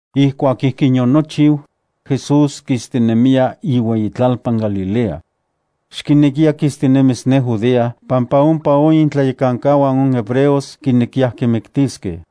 Ijkuak ijkin yonochiu, Jesús kistinemiya iueyitlalpan Galilea. Xkinekiya kistinemis ne Judea pampa ompa itlayekankauan on hebreos kinekiyaj kimiktiskej.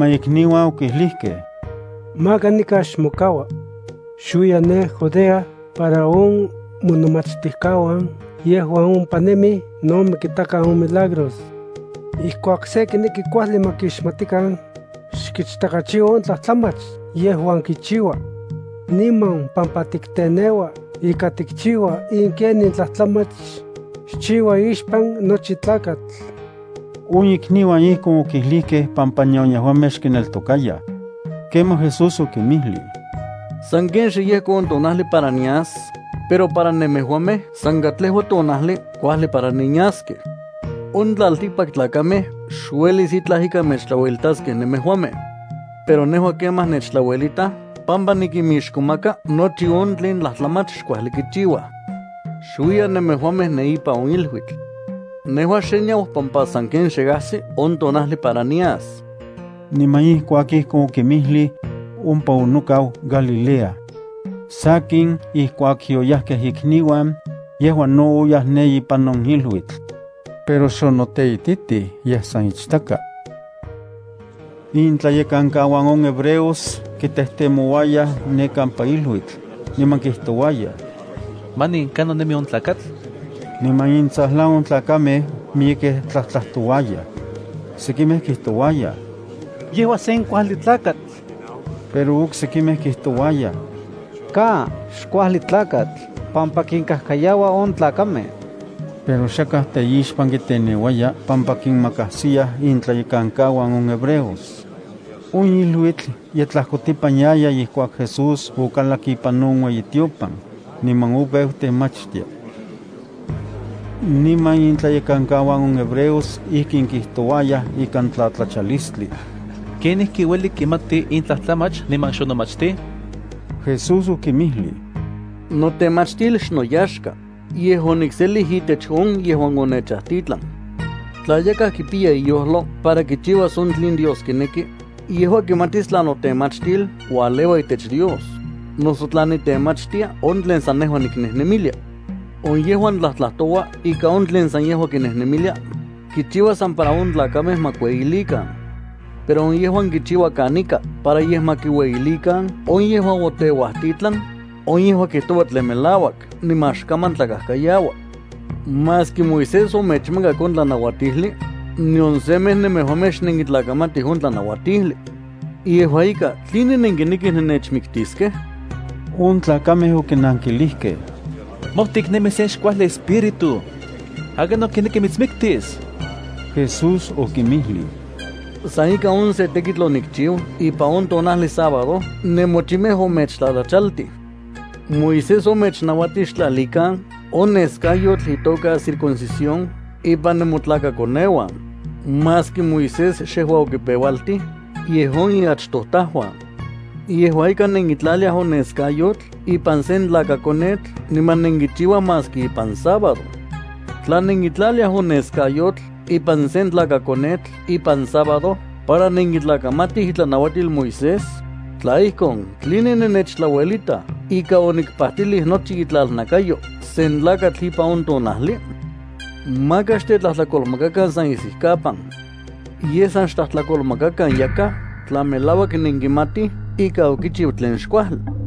niman ikniuan okijlijkej: —Maka nikan xmokaua. Xuiya ne Judea para on monomachtijkauan yejuan ompa nemij no ma kitakan on milagros. Ijkuak se kineki ma kuajli kixmatikan, xkichtakachiua on tlajtlamach yejuan kichiua. Niman pampa tikteneua ika tikchiua in ken in tlajtlamach, xchiua ixpan nochi tlakatl. On ikniuan ijkon okijlijkej pampa nion yejuamej xkineltokayaj. Kemaj Jesús okinmijlij: —Sanken xe yejko on tonajli para nias, pero para nemejuamej san katlejua tonajli kuajli para nenyaskej. On tlaltikpaktlakamej xuelis itlaj ika mechtlauelitaskej nemejuamej. Pero nejua kemaj, nechtlauelitaj pampa nikinmixkomaka nochi on tlen tlajtlamach xkuajli kichiuaj. Xuiyan nemejuamej ne ipan on iluitl. Nejua xe niau pampa sanken xe ajsi on tonajli para nias. Niman ijkuak ijkon okinmijlij, ompa onokau Galilea. Sakin ijkuak yoyajkej ikniuan, yejua no oyaj ne ipan on iluitl. Pero xonoteititij, yej san ichtaka. Itlayekankauan on hebreos kitejtemouayaj ne kampa iluitl, niman kijtouayaj: —¿Manin kanon nemi on tlakatl? Niman intsajlan on tlakamej miyekej tlajtlajtouayaj. Sekimej kijtouayaj: “Yejua sen kuajli tlakatl.” Pero oksekimej kijtouayaj: “Ka. Xkuajli tlakatl pampa kinkajkayaua on tlakamej.” Pero xakaj teixpan kiteneuaya pampa kinmakajsiyaj intlayekankauan on hebreos. On iluitl ye tlajkotipan yaya ijkuak Jesús okalak ipan on ueyitiopan, niman opeu temachtia. Niman intlayekankauan on hebreos ijkin kitouayaj ikan tlatlachalistli: —¿Kenijki ueli kimati in tlajtlamach niman xonomachtij? Jesús okinmijlij: —Notemachtil xnoyaxka, yej onikselij itech on yejuan onechajtitlan. Tla yakaj kipiya iyojlo para kichiuas on tlen Dios kineki, yejua kimatis tla notemachtil ualeua itech Dios, noso tla nitemachtia on tlen san nejua niknejnemilia. On yejuan tlajtlajtoua san on tlen yejua kinemilia, kichiua san para on tlakamej ma kueyilikan. Pero on yejuan kichiua kanika para yej ma kiueyilikan on yejuan oteuajtitlan, on yejua kijtoua tlen melauak niman xkaman tlakajkayaua. ’Maski Moisés omechmakak on tlanauatijli, nion semej nemejuamej xnenkitlakamatij on tlanauatijli. Yejua ika, ¿tline nenkinekij nennechmiktiskej? On tlakamej okinankilijkej: —Mojtik nemi sen xkuajli espíritu. ¿Akinon kineki mitsmiktis? Jesús okinmijlij: —San ika on se tekitl onikchiu ipan on tonajli sábado nemochimej omechtlachachaltij. Moisés omechnauatij xtlalikan on neskayotl itoka circuncisión ipan nemotlakakoneuan (maski Moisés xejua okipeualtij, yej on iachtojtajuan). Yejua ika, nenkitlaliaj on neskayotl ipan sen tlakakonetl niman nenkichiuaj maski ipan sábado. Tla nenkitlaliaj on neskayotl ipan sen tlakakonetl ipan sábado para nenkitlakamatij itlanauatil Moisés, tla ijkon, ¿tline nennechtlauelitaj ika onikpajtilij nochi itlalnakayo sen tlakatl ipan on tonajli? Maka xtetlajtlakolmakakan san isijkapan. Yej san xtlajtlakolmakakan yakaj tla melauak nenkimatij ika okichiu tlen xkuajli.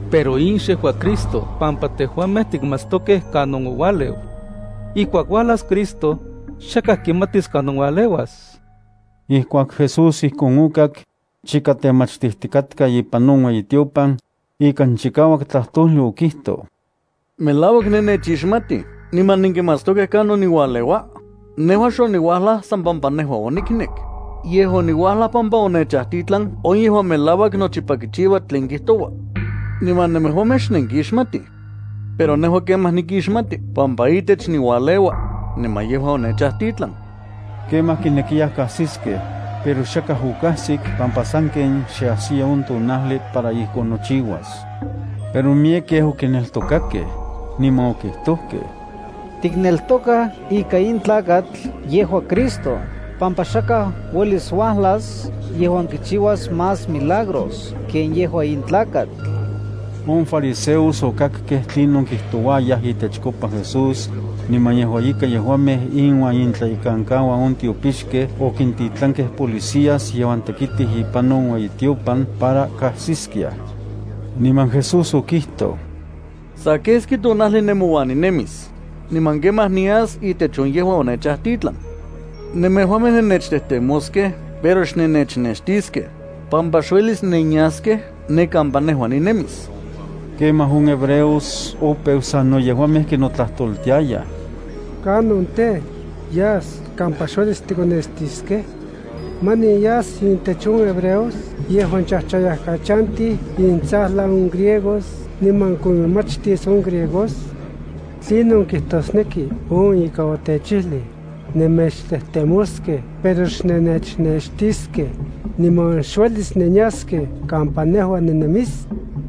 Pero in xejua Cristo pampa tejuamej tikmatstokej kanon oualeu. Ijkuak uajlas Cristo, xakaj kimatis kanon ualeuas. Ijkuak Jesús ijkon okak, chika temachtijtikatka ipan on ueyitiopan, ikan chikauak tlajtojli okijtoj: —¿Melauak nennechixmatij niman nenkimatstokej kanon niualeua? Nejua xoniuajlaj san pampa nejua oniknek, yej oniuajlaj pampa onechajtitlan on yejuan melauak nochipa kichiua tlen kijtoua. Niman nemejuamej xnenkixmatij. Pero nejua kemaj nikixmati pampa itech niualeua, niman yejua onechajtitlan. Kemaj kinekiyaj kajsiskej, pero xakaj okajsik pampa sanken xe ajsiya on tonajli para ijkon nochiuas. Pero miyekej okineltokakej, niman okijtojkej: —Tikneltokaj ika in tlakatl yejua Cristo pampa xakaj uelis uajlas yejuan kichiuas más milagros ken yejua in tlakatl. On fariseos okakkej tlinon kijtouayaj itechkopa Jesús, niman yejua ika yejuamej inuan intlayekankauan on tiopixkej okintitlankej policías yejuan tekitij ipan on ueyitiopan para kajsiskiaj. Niman Jesús okijtoj: —Sa keski tonajli nemouan ninemis, niman kemaj nias itech on yejuan onechajtitlan. Nemejuamej nennechtejtemoskej pero xnennechnextiskej, pampa xuelis nenyaskej ne kampa nejua ninemis. Kemaj on hebreos opeu sano yejuamej kinotlajtoltiayaj: —¿Kanon tej, yas kampa xuelis tikonextiskej? ¿Manin yas intech on hebreos yejuan chajchayajkachantij intsajlan on griegos niman kominmachtis on griegos? ¿Tlinon kijtosneki on ika otechijlij: “Nennechtejtemoskej pero xnennechnextiskej”, niman “Xuelis nenyaskej kampa nejua ninemis”?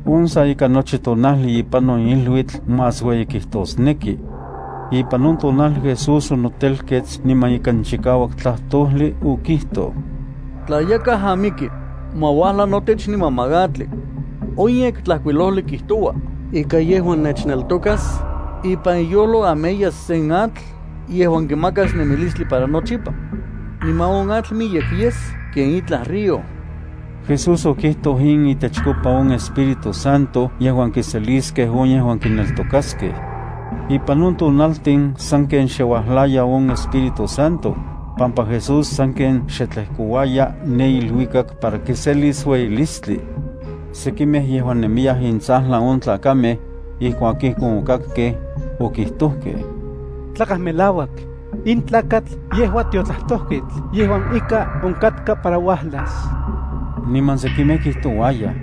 On sa ika nochi tonajli ipan on iluitl más ueyi kitosneki. Ipan on tonajli Jesús onotelkets niman ikan chikauak tlajtojli okijtoj: —Tla yakaj amiki, ma uajla notech niman ma atli. On Yektlajkuilojli kijtoua ika yejuan nechneltokas, ipan iyojlo ameyas sen atl yejuan kimakas nemilistli para nochipa. Niman on atl miyek yes ken itlaj río. Jesús okijtoj in itechkopa on Espíritu Santo yejuan kiseliskej on yejuan kineltokaskej. Ipan on tonaltin sanken xe uajlaya on Espíritu Santo, pampa Jesús sanken xe tlejkouaya ne iluikak para kiselis ueyilistli. Sekimej yejuan nemiyaj intsajlan on tlakamej, ijkuak ijkon okakkej, okijtojkej: —Tlakaj melauak, in tlakatl yejua tiotlajtojketl yejuan ika onkatka para uajlas. Niman sekimej kijtouayaj: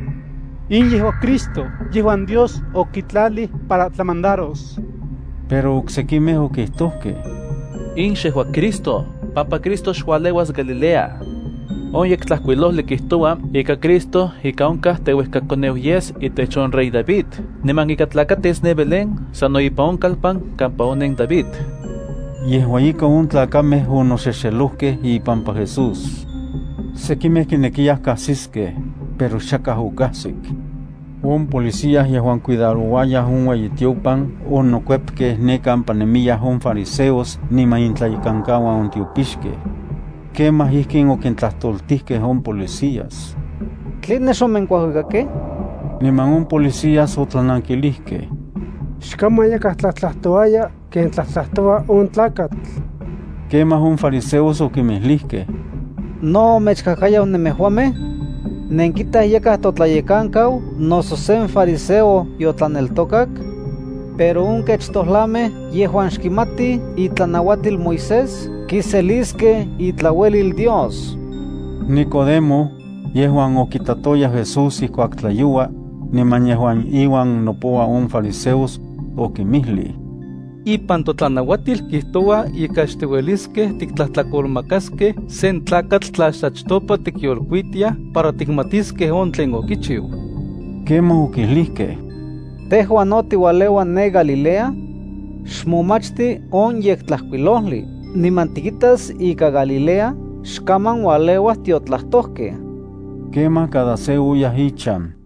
—In yejua Cristo yejuan Dios okitlalij para tlamandaros. Pero oksekimej okijtojkej: —In xejua Cristo pampa Cristo xualeuas Galilea. On Yektlajkuilojli kijtoua ika Cristo ika onkaj teuejkakoneu yes itech rey David niman ika tlakatis ne Belén sano ipan on kalpan kampa onen David. Yejua ika on tlakamej onoxexelojkej ipampa Jesús. Sekimej kinekiyaj kajsiskej, pero xakaj okajsik. On policías yejuan cuidarouaj on ueyitiopan onokuepkej ne kampa nemiyaj on fariseos niman intlayekankauan on tiopixkej. Kemaj ijkin okintlajtoltijkej on policías: —¿Tline xonenkuajuikakej? Niman on policías otlanankilijkej: —¡Xkaman yakaj tlajtlajtouaya ken tlajtlajtoua on tlakatl! Kemaj on fariseos okinmijlijkej: —¿No omechkajkayau nemejuamej? ¿Nenkitaj yakaj totlayekankau noso sen fariseo yotlaneltokak? Pero on kech tojlamej yejuan xkimatij itlanauatil Moisés kiseliskej itlauelil Dios. Nicodemo, yejuan okitatoya Jesús ijkuak tlayoua, niman yejuan inuan nopoua on fariseos, okinmijlij: —Ipan totlanauatil kijtoua ika xtiueliskej tiktlajtlakolmakaskej sen tlakatl tla xachtopa tikyolkuitiaj para tikmatiskej on tlen okichiu. Kemaj okijlijkej: —¿Tejua no tiualeua ne Galilea? Xmomachti on Yektlajkuilojli, niman tikitas ika Galilea xkaman ualeuaj tiotlajtojkej. Kemaj cada se oyaj ichan,